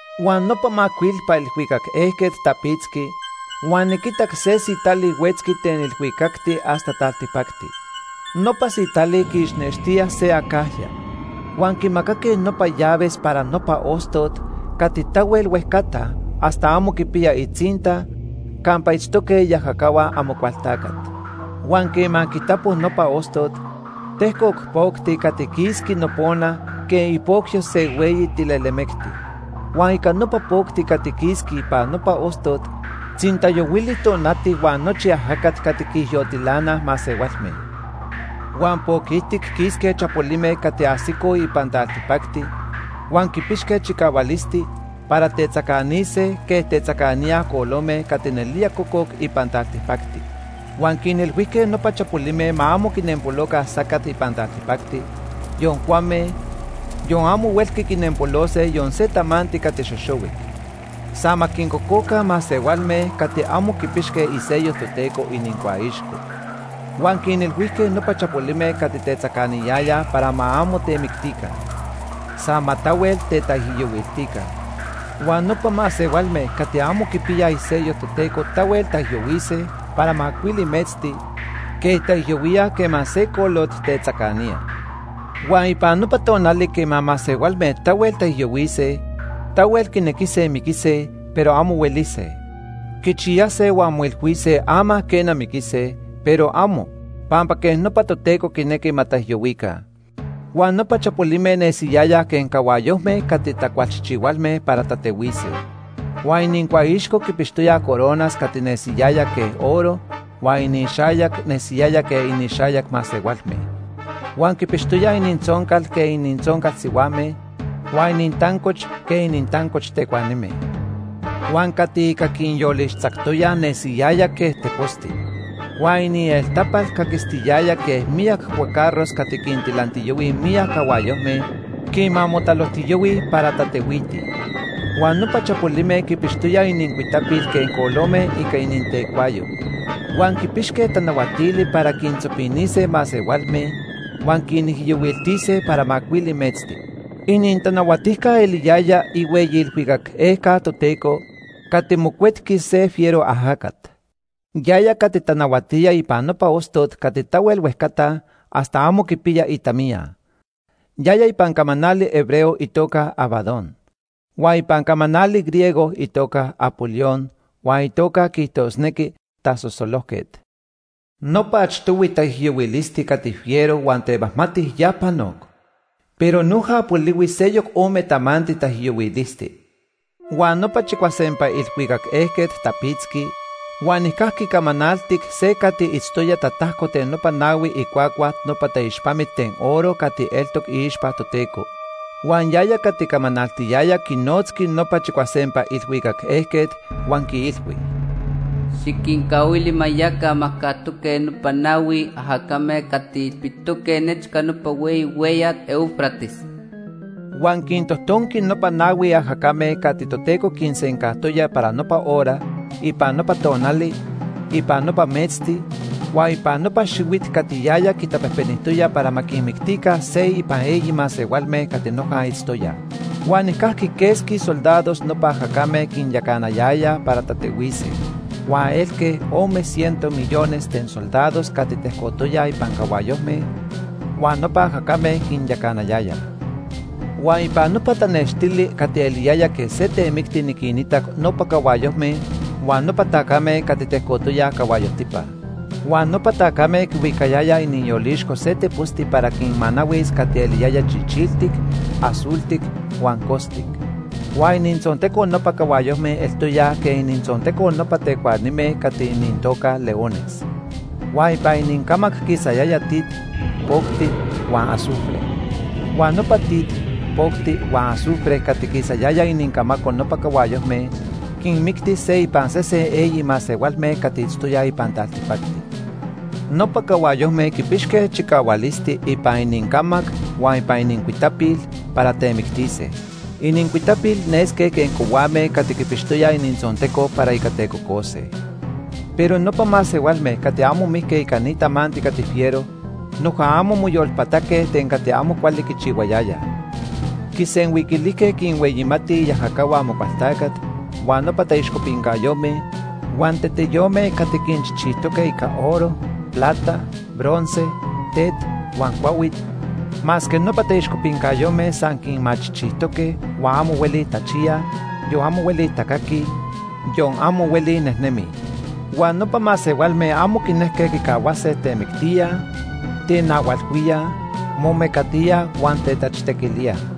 Huan nopa macuilpa ilhuicac ejquet tapitzqui huan niquitac se sitali huetzqui ten ilhuicacti hasta taltipacti. Nopa sitali quiixnextía se acajya. Huan quimacaque nopa llaves para nopa ostot cati tahuel huejcata hasta amo quipiya itzinta campa itztoque iajacahua Amocualtacat. Huan quema quitapo nopa ostot, tejcoc pocti cati quisqui nopona quej ipocyo se hueyi tilelemecti. Huan ica nopa pocti cati quisqui ipan nopa ostot tzintayohuili tonati huan nochi ajacat cati quiijyotilanaj masehualme. Huan poc ijtic quisque chapolime cati ajsicoj ipan taltipacti huan quipixque chicahualisti para tetzacanise quej tetzacaníaj colome cati nelía cococ ipan taltipacti. Huan quinilhuijque nopa chapolime ma amo quinempoloca sacat ipan taltipacti, yon cuame, yon amo huelqui quinempolose yon se tamanti cati xoxohuic. San ma quincococa masehualme cati amo quipixque isello Toteco inincuaixco. Huan quinilhuijque nopa chapolime cati tetzacaniyayaj para ma amo temictica. San ma tahuel tetaijyohuiltica. Huan nopa masehualme cati amo quipiyaj isello Toteco tahuel taijyohuise para macuili metzti quej taijyohuíaj quema se colot tetzacanía. Huan ipan nopa tonali quema masehualme tahuel taijyohuise, tahuel quinequise miquise, pero amo huelise. Quichiyase huan moilhuise ama, quena, miquise, pero amo, pampa quej nopa Toteco quinequi ma taijyohuica. Huan nopa chapolime nesiyayaj quej cahuayojme cati tacualchijchihualme para tatehuise. Huan inincuaixco quipixtoyaj coronas cati nesiyaya quej oro huan inixayac nesiyaya quej inixayac masehualme. Huan quipixtoyaj inintzoncal quej inintzoncal sihuame, huan inintancoch quej inintancoch tecuanime. Huan cati ica quinyolixtzactoyaj nesiyaya quej teposti. Huan inieltapal caquistiyaya quej miyac cuacarros cati quintilantiyahuij miyac cahuayojme quema motalojtiyahuij para tatehuitij. Huan nopa chapolime quipixtoyaj inincuitapil quej colome ica inintecuayo. Huan quipixque tanahuatili para quintzopinise masehualme huan quinijyohuiltise para macuili metzti. Inintanahuatijca eliyaya ihueyi ilhuicac ejquet Toteco cati mocuetqui se fiero ajacat. Yaya cati tanahuatía ipan nopa ostot cati tahuel huejcata hasta amo quipiya itamiya. Yaya ipan camanali hebreo itoca Abadón. Huan ipan camanali griego itoca Apolión, huan itoca quiijtosnequi Tasosolojquet. Nopa achtohui taijyohuilisti cati fiero huan temajmati ya panoc, pero noja polihui seyoc ome tamanti taijyohuilisti. Huan nopa chicuasempa ilhuicac ejquet tapitzqui huan nijcajqui camanaltic se cati itztoya tatajco ten nopa nahui icuacua nopa taixpamit ten oro cati eltoc iixpa Toteco. Huan yaya cati camanaltiyaya quinotzqui nopa chicuasempa ilhuicac ejquet huan quiilhui: “Xiquincahuili ma yaca majcajtoque nopa nahui ajacame cati ilpitoque nechca nopa hueyi hueyat Éufrates.” Huan quintojtonqui nopa nahui ajacame cati Toteco quinsencajtoya para nopa hora, ipan nopa tonali, ipan nopa metzti, huan ipan nopa xihuit cati yaya quitapejpenijtoya para ma quinmictica se ipan eyi masehualme cati noja itztoyaj. Huan nijcajqui quesqui soldados nopa ajacame quinyacanayayaj para tatehuise. Huan elque ome ciento millones ten soldados cati tejcotoyaj ipan cahuayojme huan nopa ajacame quinyacanayayaj. Huan ipan nopa tanextili cati eliyaya quej se temicti niquinitac nopa cahuayojme huan nopa tacame cati tejcotoyaj cahuayojtipa. Huan nopa tacame quihuicayayaj iniyolixco se teposti para quinmanahuis cati eliyaya chichiltic, azultic huan costic. Huan inintzonteco nopa cahuayojme eltoya quej inintzonteco nopa tecuanime cati inintoca leones. Huan ipan inincamac quisayaya tit, pocti huan azufre. Huan nopa tit, pocti huan azufre cati quisayaya inincamaco nopa cahuayojme quinmicti se ipan sese eyi masehualme cati itztoyaj ipan taltipacti. Nopa cahuayojme quipixque chicahualisti ipan inincamac huan ipan inincuitapil para temictise. Inincuitapil nesque quej cohuame cati quipixtoyaj inintzonteco para ica tecocose. Pero nopa masehualme cati amo mijque ica ni tamanti cati fiero noja amo moyolpataque ten cati amo cuali quichihuayayaj. Quisenhuiquilijque quinhueyimatij iajacahua Amocualtacat huan nopa taixcopincayome huan teteyome cati quinchijchijtoque ica oro, plata, bronce, tet huan cuahuit, masque nopa taixcopincayome san quinmachijchijtoque huan amo hueli tachiyaj, yon amo hueli tacaquij, yon amo hueli nejnemij. Huan nopa masehualme amo quinejque quicahuase temictíaj, tenahualhuíaj, momecatíaj huan tetachtequilíaj.